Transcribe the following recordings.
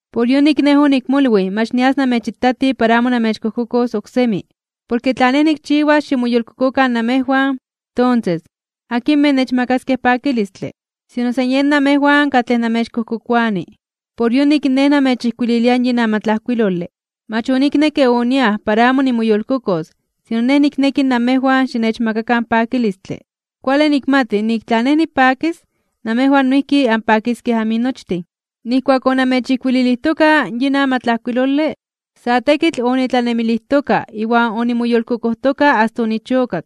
Por yonik nej onikmolwij mach nias namechitati para amo namechkojkokos oksemi. Porke tla nej nikchiwas ximoyolkokokan namejwan, tonses ¿akinmej nechmakaskej pakilistle? Sino san yen namejwan katlej namechkojkokoani. Por yonik nej namechijkuililia yin amatlajkuilole. Mach oniknekke oniaj para amo nimoyolkokos sino nej nikneki namejwan xinechmakakan pakilistle. Kuale nikmati nik tla nej nipakis, namejwan noijki anpakiskej aminochtin. Nijkuak onamechijkuililijtoka yin amatlajkuilole, sa tekitl onitlanemilijtoka iwan onimoyolkokojtoka asta onichokak.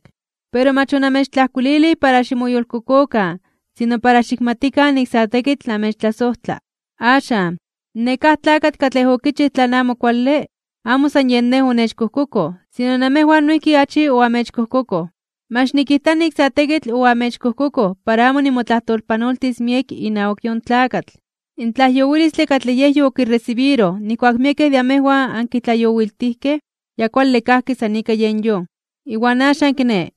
Pero mach onamechtlajkuililij para ximoyolkokokan sino para xikmatikan nik sa tekitl namechtlasojtla. Axan, nekáj tlakatl katlej okichij tlan amo kuale, amo san yen nej onechkojkokoj sino namejwan noijki achi oamechkojkokoj. Mach nikijta nik sa tekitl oamechkojkokoj para amo nimotlajtolpanoltis miek inawak yon tlakatl. In tlajyowilistle katlej yej yokiresibiroj nijkuak miekej de amejwan ankitlajyowiltijkej, ya kuale kajki san ika yen yon. Iwan axan kiné,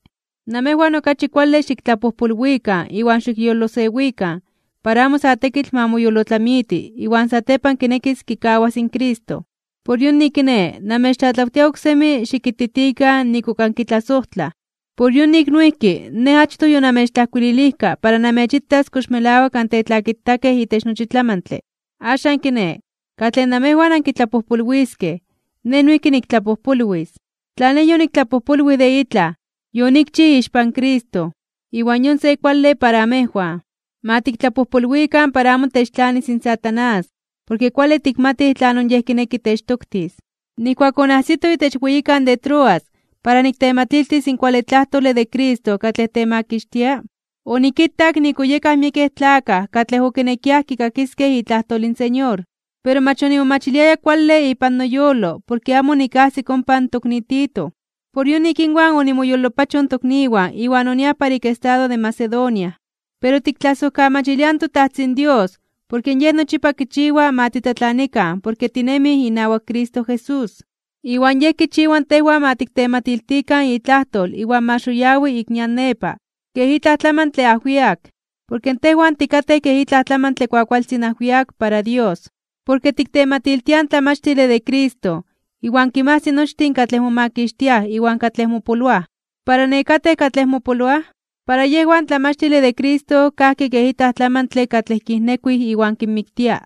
namejwan okachi kuale xiktlapojpolwikan iwan xikyolosewikan, para amo sa tekitl ma moyolotlamiti iwan satepan kinekis kikawas in Cristo. Por yonik kiné namechtlatlawtia oksemi xikititikan nik ok ankitlasojtlaj. Por yonik noijki, nej achtoj yonamechtlajkuililijka para namechitas kox melawak antetlakitakej itech nochi tlamantle. Axan kiné, katlej namejwan ankitlapojpolwiskej, nej noijki niktlapojpolwis. Tla nej yoniktlapojpolwij de itlaj, yonikchij ixpan Cristo, iwan yon se kuale para amejwan. Ma tiktlapojpolwikan para amo techtlanis in Satanás, porke kuale tikmatij tlanon yej kineki techtoktis. Nijkuak onajsito itech weyikan de Troas para niktematiltis in kuale tlajtole de Cristo katlej temakixtia, onikitak nik oyekaj miekej tlakaj katlej okinekiaj kikakiskej itlajtol in Señor. Pero mach onimomachiliaya kuale ipan noyolo porke amo onikajsik ompa in tokni Tito. Por yonik inwan onimoyolopachoj in tokniwan iwan oniaj para ik estado de Macedonia. Pero tiktlasojkamachiliaj in toTajtzin Dios porke Yej nochipa kichiwa ma titlatlanikan porke tinemij iwan Cristo Jesús. Iwan Yej kichiwa tejwan ma tiktematiltikan itlajtol iwan ma xoyawi (xitini) ik nian nepa kej itlaj tlamantle ajwiak. Porke tejwan tikatej kej itlaj tlamantle kuakualtzin ajwiak para Dios, porke tiktematiltiaj in tlamachtile de Cristo iwan kinmajsi nochtin katlej momakixtiaj iwan katlej mopoloaj. Para nekatej katlej mopoloaj, para yejwan in tlamachtile de Cristo kajki kej itlaj tlamantle katlej kijnekuij iwan kinmiktia.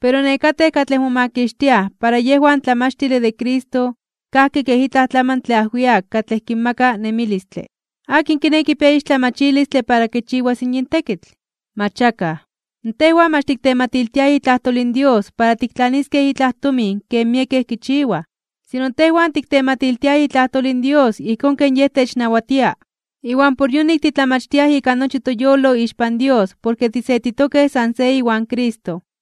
Pero nekatej katlej momakixtiaj para yejwan in tlamachtile de Cristo kajki kej itlaj tlamantle ajwiak katlej kinmaka nemilistle. ¿Akin kiné kipia ixtlamachilistle para kichiwas yin tekitl? ¡Mach akaj! Tejwan mach tiktematiltiaj itlajtol in Dios para tiktlaniskej itlaj tomin ken miekej kichiwaj. Sino tejwan tiktematiltiaj itlajtol in Dios ijkón ken Yej technawatia, iwan por yonik titlamachtiaj ika nochi toyolo ixpan Dios porke tisetitokej san se iwan Cristo.